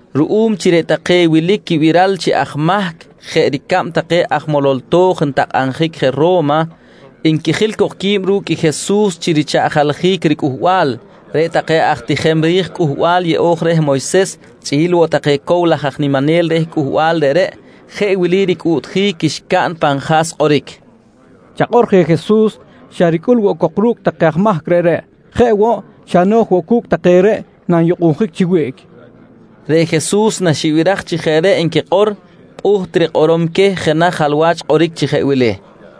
Ruꞌum chi reꞌ take wilic quibiral chi aj mahc jeꞌ ricab take aj molol to̱j ntakꞌabjic je Ro̱ma, nquijil cok qui̱b ru̱cꞌ Jesus chi richaꞌjaljic ricꞌuhbal, reꞌ take aj tijem ri̱j Cꞌuhbal Yeꞌo̱j reh Moyses chꞌi̱l woꞌ take cow laj aj niminel reh cꞌuhbal reꞌreꞌ jeꞌ wili ricꞌuꞌtjic xcaꞌn pan ja̱s kꞌoric: «Chakꞌor je Jesus xa ricꞌul woꞌ cok ru̱cꞌ take aj mahc reꞌreꞌ. Jeꞌ woꞌ, xa no̱j woꞌ cu̱cꞌ take reꞌ nanyukꞌunjic chi wiꞌc, nqui ricꞌuꞌtjic xcaꞌn. Reꞌ Jesus naxibiraj chi jeꞌ reꞌ nquikꞌor pꞌuht rikꞌorom queh jenaj jalwach kꞌoric chi jeꞌ wili: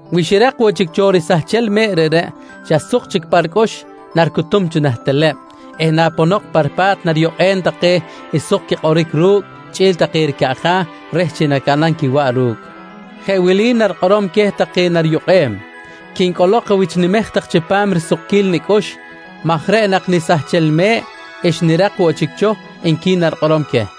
Wi xirak woꞌ chic cho risahchel me̱ꞌ reꞌreꞌ, xa suk chic pa ricꞌux naricutum cho nah teleb eh naponok pa ripa̱t nariyukꞌem take suk quikꞌoric ru̱cꞌ chꞌi̱l take ricaꞌja̱ reh chi nacaꞌnam quiwaꞌ ru̱cꞌ. Jeꞌ wili narikꞌorom queh take nariyukꞌem: ‹Quincꞌolok awichnimej tak chipam risukquil nicꞌux maj reꞌ nak nisahchel me̱ꞌ xnirak woꞌ chic cho, nqui narikꞌorom queh.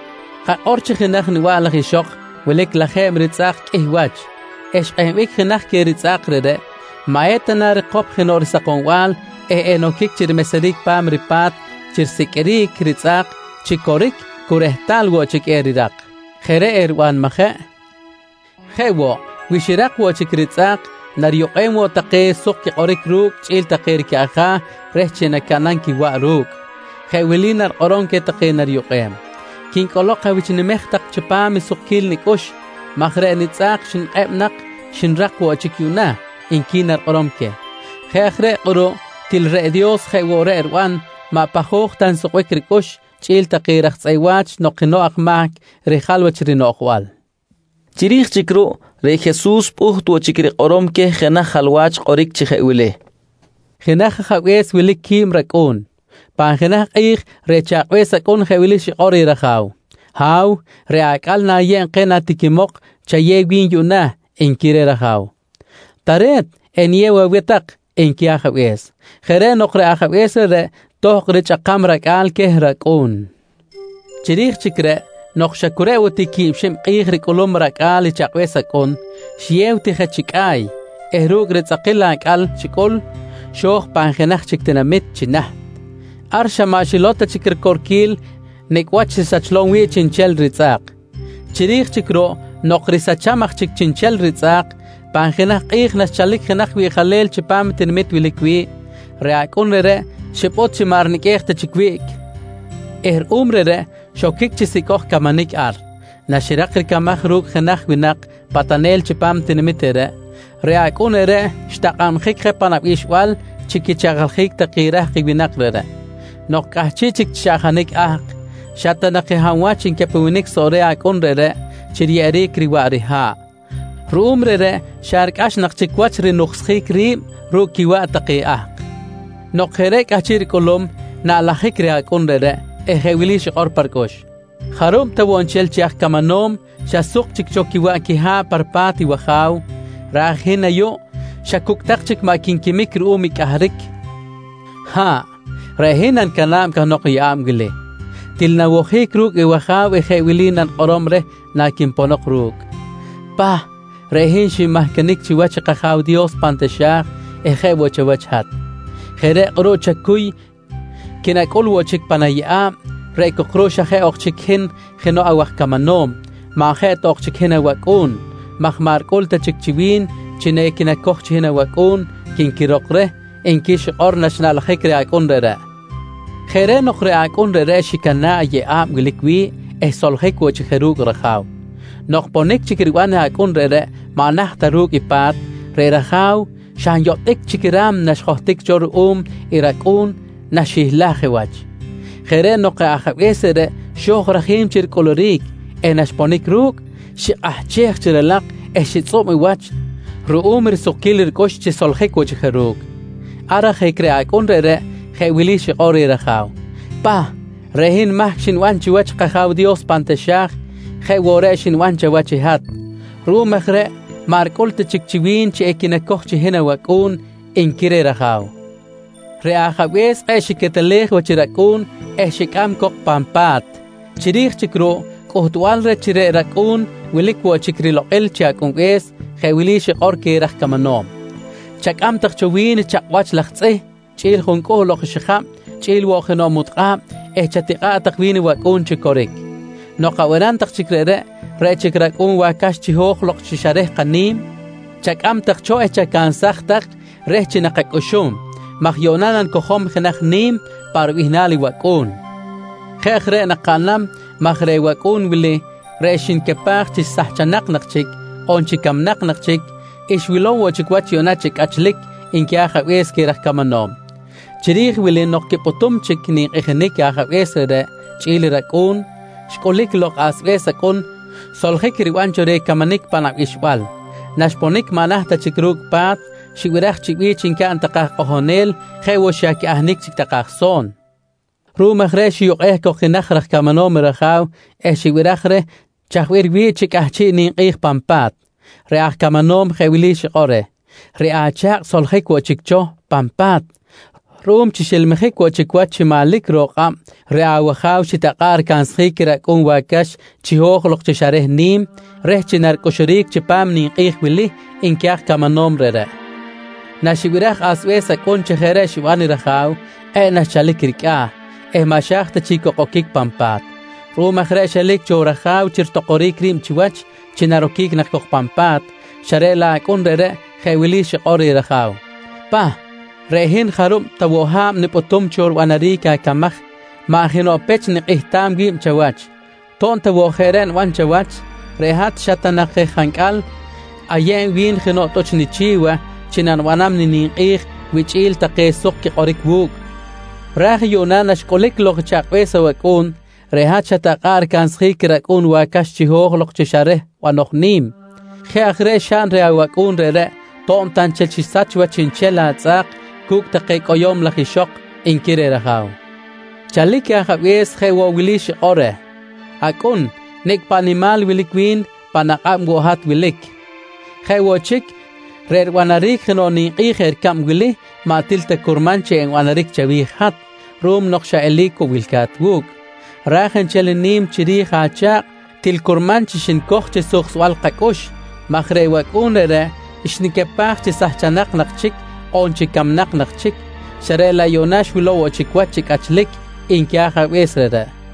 «Kakꞌor chi jenaj niba̱ꞌ laj ixok wilic lajeb ritzꞌa̱k qꞌuih wach eh xkꞌehbic jenaj queh ritzꞌa̱k reꞌreꞌ, maꞌ eta na rikop jenoꞌ risakombal eh enoquic chi rimeseric pa̱m ripa̱t chi risiqꞌuiric ritzꞌa̱k chi coric cu rehtal woꞌ chic erirak? Jeꞌ reꞌ eriban majeꞌ? Jeꞌ woꞌ, wi xirak woꞌ chic ritzꞌa̱k nariyukꞌem woꞌ take suk quikꞌoric ru̱cꞌ chꞌi̱l take ricaꞌja̱ reh chi nacaꞌnam quiwaꞌ ru̱cꞌ. Jeꞌ wili narikꞌorom queh take nariyukꞌem: ‹Quincꞌolok awichnimej tak chipam risukquil nicꞌux maj reꞌ nitzꞌa̱k reꞌ xnikꞌeb nak xnirak woꞌ chic yuꞌna, nqui narikꞌorom queh. «Jeꞌ aj reꞌ kꞌuruꞌ til reꞌ Dios jeꞌ woꞌ reꞌ riban maꞌ pajoj ta woꞌ nsukbic ricꞌux chꞌi̱l take raj tzꞌeꞌ wa̱ch nok jenoꞌ aj mahc rijal wach rinoꞌjbal, nqui Jesus queh. Chiri̱j chic ruꞌ, reꞌ Jesus pꞌuht woꞌ chic rikꞌorom queh jenaj jalwach kꞌoric chi jeꞌ wili: «Jenaj ajabe̱s wilic quib racꞌu̱n. Pan jenaj kꞌi̱j reꞌ chakꞌbe̱s acꞌun jeꞌ wili xikꞌor reh raja̱w: ‹Ha̱w, reꞌ acꞌal na̱yeb keh natiquimok chayew wi̱n yuꞌna, nqui reh raja̱w. —Tare̱t, eniyew aweh tak, nqui ajabe̱s. «Jeꞌ reꞌ nok, reꞌ ajabe̱s reꞌreꞌ tohkꞌ richꞌakam racꞌa̱l queh racꞌu̱n. Chiri̱j chic reꞌ nok xa cu reꞌ woꞌ ti quib xib kꞌi̱j ricꞌulum racꞌa̱l i chakꞌbe̱s acꞌun, xiyew ti je chi cꞌa̱y eh ru̱cꞌ ritzꞌakil acꞌal xicꞌul, xo̱j pan jenaj chic tinamit chi naht. Ar xa maꞌ xilow ta chic ricorquil nicꞌ wach xisahchlom wi̱ꞌ chiꞌnchel ritzꞌa̱k. «Chiri̱j chic ruꞌ nok risacham aj chic chiꞌnchel ritzꞌa̱k, pan jenaj kꞌi̱j naxchalic jenaj wiꞌjalel chipam i tinamit wilic wi̱ꞌ, reꞌ acꞌun reꞌreꞌ xipꞌut chi maꞌ riniqꞌuej ta chic wiꞌc eh ruꞌum reꞌreꞌ xoquic chi sicꞌoj camanic ar. Naxirak ricamaj ru̱cꞌ jenaj winak patanel chipam i tinamit reꞌreꞌ, reꞌ acꞌun reꞌreꞌ xtakꞌabjic je pan abixbal chi quichaꞌjaljic take rahk i winak reꞌreꞌ. Nok cꞌahchiꞌ chi chaꞌjanic ahk, xa ta nak je hab wach ncapewenic soꞌ reh acꞌun reꞌreꞌ chi riyeꞌeric riwaꞌ riha̱ꞌ. Ruꞌum reꞌreꞌ xa ricꞌax nak chic wach chi rinuksjic ri̱b ru̱cꞌ quiwaꞌ take ahk. Nok jeꞌ reꞌ cꞌahchiꞌ ricꞌulum, naꞌlajic reh acꞌun reꞌreꞌ eh jeꞌ wili xikꞌor pa ricꞌux: ‹Jarub ta woꞌ nchel chi aj camanom xa suk chic cho quiwaꞌ quiha̱ꞌ ar pa ripa̱t i waja̱w, ra̱j hin ayuꞌ xa cucꞌ tak chic maꞌ quinquimic ruꞌum i cꞌahric. Ha̱ꞌ, reꞌ hin nanicana̱b cahnok i yeꞌa̱b wili. Til nawojic ru̱cꞌ i waja̱w eh jeꞌ wili nanikꞌorom reh naquinponok ru̱cꞌ: ‘Pah, reꞌ hin xinmahcanic chiwach kAja̱w Dios pan taxa̱j, jeꞌ woꞌ chawach i hat. Jeꞌ reꞌ kꞌuruꞌ chacuy quinacꞌul woꞌ chic pan ayeꞌa̱b reꞌ cok ruꞌ xa jeꞌ ok chic hin jenoꞌ awaj camanom, maꞌ jeꞌ ta ok chic chi hin awacꞌu̱n maj maꞌ ricꞌul ta chic chi wi̱n chi equinacoj chi hin awacꞌu̱n, quinquirok reh, nqui xikꞌor naxnaꞌlajic reh acꞌun reꞌreꞌ. «Jeꞌ reꞌ nok reꞌ acꞌun reꞌreꞌ xicana̱ꞌ je yeꞌa̱b wilic wi̱ꞌ eh xsoljic woꞌ chic je ru̱cꞌ raja̱w. Nok ponic chic riban i acꞌun reꞌreꞌ maꞌ naht ta je ru̱cꞌ pa̱t, reꞌ raja̱w xa nyotꞌic chic i ra̱mna xjohtic cho ruꞌum i racꞌu̱n naxihlaj je wach. Jeꞌ reꞌ nok reꞌ ajabe̱s reꞌreꞌ xo̱j rajim chi ricꞌuluric eh naxponic ru̱cꞌ, xikꞌahchej chi ralak eh xitzꞌub i wach ruꞌum risukquil ricꞌux chi xsoljic woꞌ chic je ru̱cꞌ. Ar ajic reꞌ acꞌun reꞌreꞌ jeꞌ wili xikꞌor reh raja̱w: ‹Pah, reꞌ hin mahc xniban chiwach kAja̱w Dios pan taxa̱j jeꞌ woꞌ reꞌ xniban chawach i hat. Ruꞌum aj reꞌ maꞌ ricꞌul ta chic chi wi̱n chi equinacoj chi hin awacꞌu̱n, nqui reh raja̱w. «Reꞌ ajabe̱s kꞌe̱ꞌ xiquetelej wach i racꞌu̱n eh xicꞌam cok pan pa̱t. Chiri̱j chic ruꞌ cꞌuhtbal reh chi reꞌ racꞌu̱n wilic woꞌ chic rilokꞌil chi acꞌunbe̱s, jeꞌ wili xikꞌor queh raj camanom: ‹Chacꞌam tak cho wi̱n chakꞌwach laj tzꞌih chꞌi̱l juncꞌuhl ok xijab chꞌi̱l woꞌ jenoꞌ mutkꞌab eh chatikꞌa̱ꞌ tak wi̱n i wacꞌu̱n chi coric. Nok abanam tak chic reꞌreꞌ, reꞌ chic i racꞌu̱n wacax chiho̱j lok chi xa reh kani̱m chacꞌam tak cho eh chacansaj tak reh chi nakacꞌuxum maj yuꞌna nakacojom jenaj ni̱m pa ribihnal i wacꞌu̱n. Jeꞌ aj reꞌ nakaꞌnam maj reꞌ wacꞌu̱n wili reꞌ xnicapaj chi sahchanak nak chic, on chi camnak nak chic, xwilow woꞌ chic wach yuꞌna chi cꞌachlic, nqui ajabe̱s queh raj camanom. «Chiri̱j i wili nok quipꞌutum chic ninkꞌijinic i ajabe̱s reꞌreꞌ chꞌi̱l i racꞌu̱n, xcꞌulic lok i asbe̱s acꞌun soljic riban cho reh camanic pan abixbal. Naxponic maꞌ naht ta chic ru̱cꞌ pa̱t, xibiraj chi bi̱ch ncaꞌn take aj kꞌojonel jeꞌ woꞌ chi xa quiꞌahnic chic take aj so̱n. Ruꞌum aj reꞌ xiyukꞌej cok jenaj raj camanom i raja̱w eh xibiraj reh chaj bih riwi̱ꞌ chi cꞌahchiꞌ ninkꞌi̱j pan pa̱t. Reꞌ aj camanom jeꞌ wili xikꞌor reh: ‹Reꞌ acha̱kꞌ xsoljic woꞌ chic cho pan pa̱t. Ruꞌum chi xilmijic woꞌ chic wach chi manlic ro̱k kꞌab reꞌ awaja̱w xitakꞌa̱ꞌ ricansjic i racꞌu̱n wacax chiho̱j lok chi xa reh ni̱m reh naricꞌuxuric chipam ninkꞌi̱j wili, nqui aj camanom reꞌreꞌ. «Naxibiraj asbe̱s acꞌun chi jeꞌ reꞌ xiban i raja̱w, kꞌe̱ꞌ naxchalic ricꞌa̱ eh maꞌ xa̱j ta chic cok oquic pan pa̱t. Ruꞌum aj reꞌ xelic cho raja̱w chi ritokoric ri̱b chiwach chi naroquic nak cok pan pa̱t, xa reꞌ laꞌ acꞌun reꞌreꞌ jeꞌ wili xikꞌor reh raja̱w: ‹Pah, reꞌ hin jarub ta woꞌ ha̱b nipꞌutum cho ribanaric acamaj maꞌ jenoꞌ pech nikꞌihtam wi̱b chawach. To̱b ta woꞌ jeꞌ reꞌ niban chawach, reꞌ hat xa ta nak je jancꞌal ayeb wi̱n jenoꞌ tꞌuch nichi̱wa chi nanibanam nininkꞌi̱j wichꞌi̱l take suk quikꞌoric wu̱cꞌ. Ra̱j yuꞌna naxcꞌulic lok i chakꞌbe̱s awacꞌu̱n, reꞌ hat xatakꞌa̱ꞌ ricansjic i racꞌu̱n wacax chiho̱j lok chi xa reh banoj ni̱m. Jeꞌ aj reꞌ xaꞌn reh awacꞌu̱n reꞌreꞌ to̱b ta nchel xisach wach chiꞌnchel atzꞌa̱k cu̱cꞌ take cꞌoyo̱m laj ixok, nqui reh raja̱w. «Chalic i ajabe̱s jeꞌ woꞌ wili xikꞌor reh: ‹Acꞌun, nicꞌ paꞌ nimal wilic wi̱n pan akꞌab woꞌ hat wilic. Jeꞌ woꞌ chic, reꞌ ribanaric jenoꞌ ninkꞌi̱j jeꞌ ricab wili maꞌ til ta curman chi enbanaric chawi̱j i hat ruꞌum nok xa eli̱c woꞌ wilca̱t wu̱cꞌ. Ra̱j nchel ni̱m chiri̱j acha̱kꞌ til curman chi xnicoj chi suksbal kacꞌux maj reꞌ wacꞌu̱n reꞌreꞌ xnicapaj chi sahchanak nak chic on chi camnak nak chic, xa reꞌ laꞌ yuꞌna xwilow woꞌ chic wach chi cꞌachlic, nqui ajabe̱s reꞌreꞌ, nqui Jesus queh winak reꞌreꞌ.